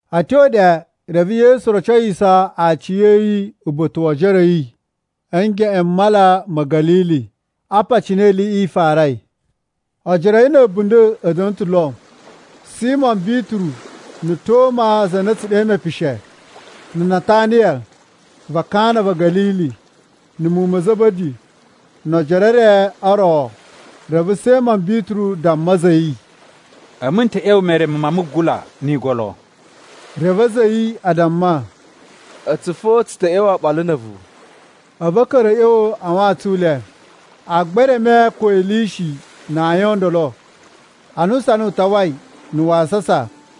A̱ tyo ɗe, reve Yesu rocowiso aciya̱yi uba̱ta̱ wo ojoro a̱ yi a̱ ngeꞌen m Mala ma̱ Ga̱lili. Apa cine iliꞌi i farai: Ojoro a̱ yi na̱ a̱bunda̱ a̱ da̱na̱ ta̱ lo: Simo Bituru, na̱ Toma (za na a̱ tsu ɗe Mepishe), na̱ Nataniya va Kana va̱ Ga̱lili, na̱ muwun ma̱ Za̱ba̱di, no ojoro e re o ro. Reve Simo Bituru damma a̱za̱ a̱ yi, “A̱mu n ta̱ ꞌya̱wa̱ mereme ma mugula ni igolo.” Reve a̱za̱ a̱ yi a damma, “A̱tsu fo tsu ta̱ ꞌya̱wa̱ oɓolo na̱ a̱vu.” A̱vu a̱ ka̱ra̱ a̱ ꞌya̱wa̱ a wantsun u le. Agba e reme ko ili i shi na ayin o ndolo. Ana usana u tawai na̱ wasasa,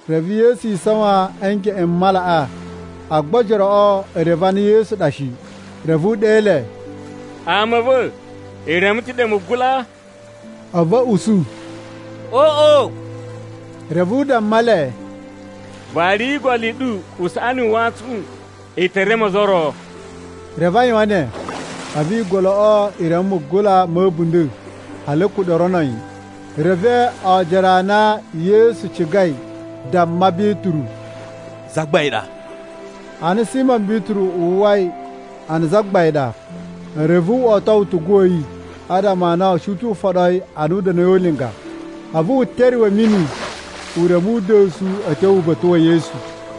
reve Yesu isawan a̱ ngeꞌen m malaꞌa, agba ojoroꞌo e reve a na Yesu ɗa shi. Reve u ɗe le, “Ama a̱ va̱, i reme ta̱ ɗe mugula?” A̱vu a̱ usu, “Oꞌo.” Reve u damma le, “Variyi igolo i ɗu usaꞌani u wantsun u ɗu, i te reme ozo o ro.” Reve a yuwan ne, a̱vu igoloꞌo e reme mugula ma̱ a̱bunda̱ hali a̱ kuɗa̱ o rono yi. Reve oojoro a na Yesu cigai damma Bituru, “Zagbain ɗa!” Ana Simo Bituru uwwai a na Zagbain ɗa, reve wo oto utugu wa̱ yi (adama a na u shi ta̱ u foɗo yi ana u da̱na̱i o ulinga), a̱vu wu teruwe a̱ mini u reme uda̱su a̱ tyo uba̱ta̱ wa̱ Yesu.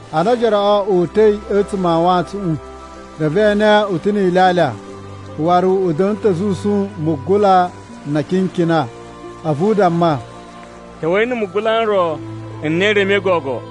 Ana ojoroꞌo o uta̱i a̱tsuma̱ a wantsuꞌun, reve e ene u ta̱ ni ilyalya, waru u da̱na̱ ta̱ a̱ zusun mugula na akinkina. A̱vu u damma, “Ta̱wa̱i na̱ mugula n ro n na i remei gogo.”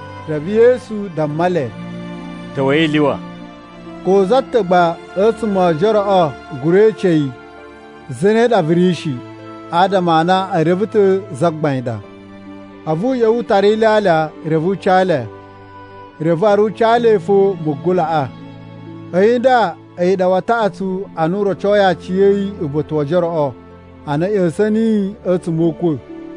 Reve Yesu damma le, “Ta̱wa̱i i lyuwa.” Ko za ta̱ gba a̱tsuma̱ o ojoroꞌo gura ece yi, “Zane ɗa vu ri?” shi, adama a na e reve ta̱ a na Zagbain ɗa. A̱vu u ꞌya̱wa̱ u tara ilyalya, reve u ca le. Reve waru u ca le fo mugulaꞌa. A̱yi nda, a̱yi ɗa wa taꞌatsu a na u rocoi aciya̱yi uba̱ta̱ wo ojoroꞌo ana a̱ ꞌya̱sa̱n niyi a̱tsuma̱ o ukwa̱.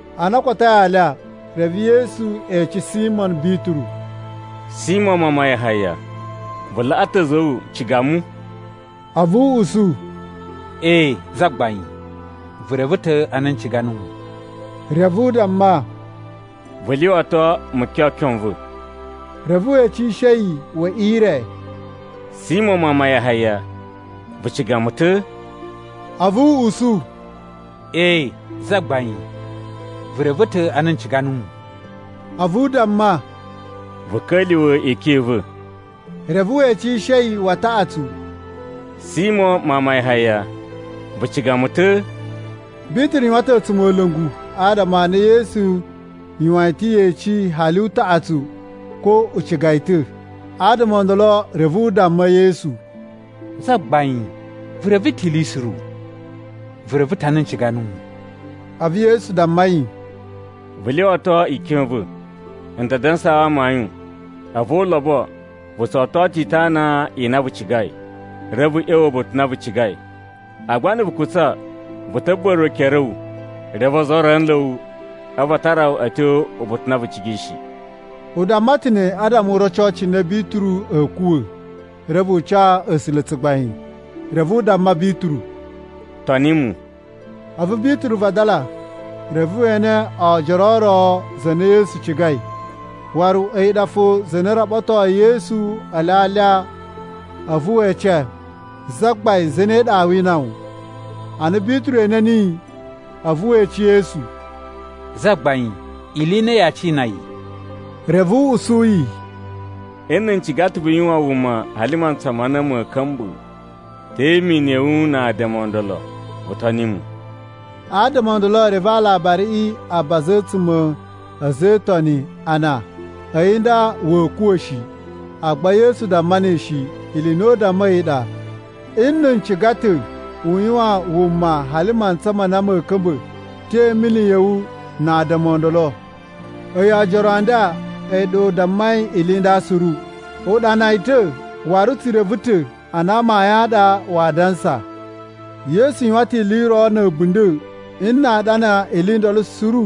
Ana o kotoi alya, reve Yesu ece Simo Bituru, “Simo mawun ma Yahaya, vu laꞌa ta̱ a̱za̱ a̱ wu ciga mu?” A̱vu u usu, “Ee, Zagbain, vu reve ta̱ a na n ciga nuwu.” Reve u damma, “Vu lyuwato mukyokyon n va̱.” Reve we ecishe yi we ire, “Simo mawun ma Yahaya, vu ciga mu ta̱?” A̱vu u usu, “Ee, Zagbain, vu reve ta̱ a na n ciga nuwu!” A̱vu u damma, “Vu ka̱lyuwa̱ ikyon i va̱.” Reve we ecishe yi wa taꞌatsu, “Simo mawun ma Yahaya, vu ciga mu ta̱?” Bituru yuwan ta̱ a̱tsumola̱ngu adama a na Yesu yuwan yi ta̱ yeci hali utaꞌatsu ko u ciga yi ta̱. Adama o ndolo reve u damma Yesu, “Zagbain, vu reve ta̱ ili suru. Vu reve ta̱ a na n ciga nuwu.” A̱vu Yesu damma yi, “Vu lyuwato ikyon i va̱. N ta dansaa wu amayun, a̱vu o ulobo, vu tso oto ta̱ itana i na vu cigai, reve vu ꞌya̱wa̱ uba̱ta̱ u na vu cigai. Agba na̱ vu kutsa, vu ta̱ buba̱ruwa̱ e ekere a̱ wu. Reve ozo o ro a̱ nla̱ wu a̱vu a tara wu a̱ tyo uba̱ta̱ u na vu cigai shi.” (U damma ta̱ ne adama u roco cine Bituru a̱a̱ kuwa̱, reve u ca A̱sula̱ tsugbain.) Reve u damma Bituru, “Toni mu!” A̱vu Bituru vadala reve we ene oojoro o ro, za na Yesu cigai. Waru a̱yi ɗa fo za na raɓatoi Yesu ele a alya a̱vu we ece, “Zagbain, zane ɗa aa wina wu?” Ana Bituru ene niyi, a̱vu we ece Yesu, “Zagbain, ili i ne yaa cina yi?” Reve u usu yi, “Nna̱ n ciga ta̱ u yuwan wuma hali mantsa ma na ma̱a̱ ka̱mba̱, te imini ya̱ wu na adama o ndolo? Vu toni mu.” Adama o ndolo reve aalabariꞌi a baza a̱tsuma̱ a̱ a̱za̱ e Itoni a na, a̱yi nda wa̱a̱ kuwa̱ shi. Agba Yesu damma ne shi. Ili i na u dammai a̱yi ɗa, “Nna̱ n ciga ta̱ u yuwan wuma hali mantsa ma na ma̱a̱ ka̱mba̱, te imini ya̱ wu na adama o ndolo?” A̱yi oojoro a nda a̱yi ɗa u dammai ili i nda suru. U ɗana yi ta̱, waru tsu reve ta̱ a na amayun a ɗa waa dansa. Yesu yuwan ta̱ ili i ro na̱ a̱bunda̱. Nna a ɗana ili i ndolo suru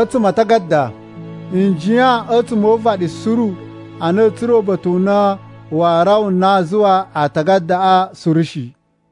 a̱tsuma̱ a atagada, n jiyan a̱tsuma̱ o uvaɗi suru a na a̱a̱ tsura̱ uba̱ta̱ u na waa rawa a na a zuwa atagadaꞌa suru shi.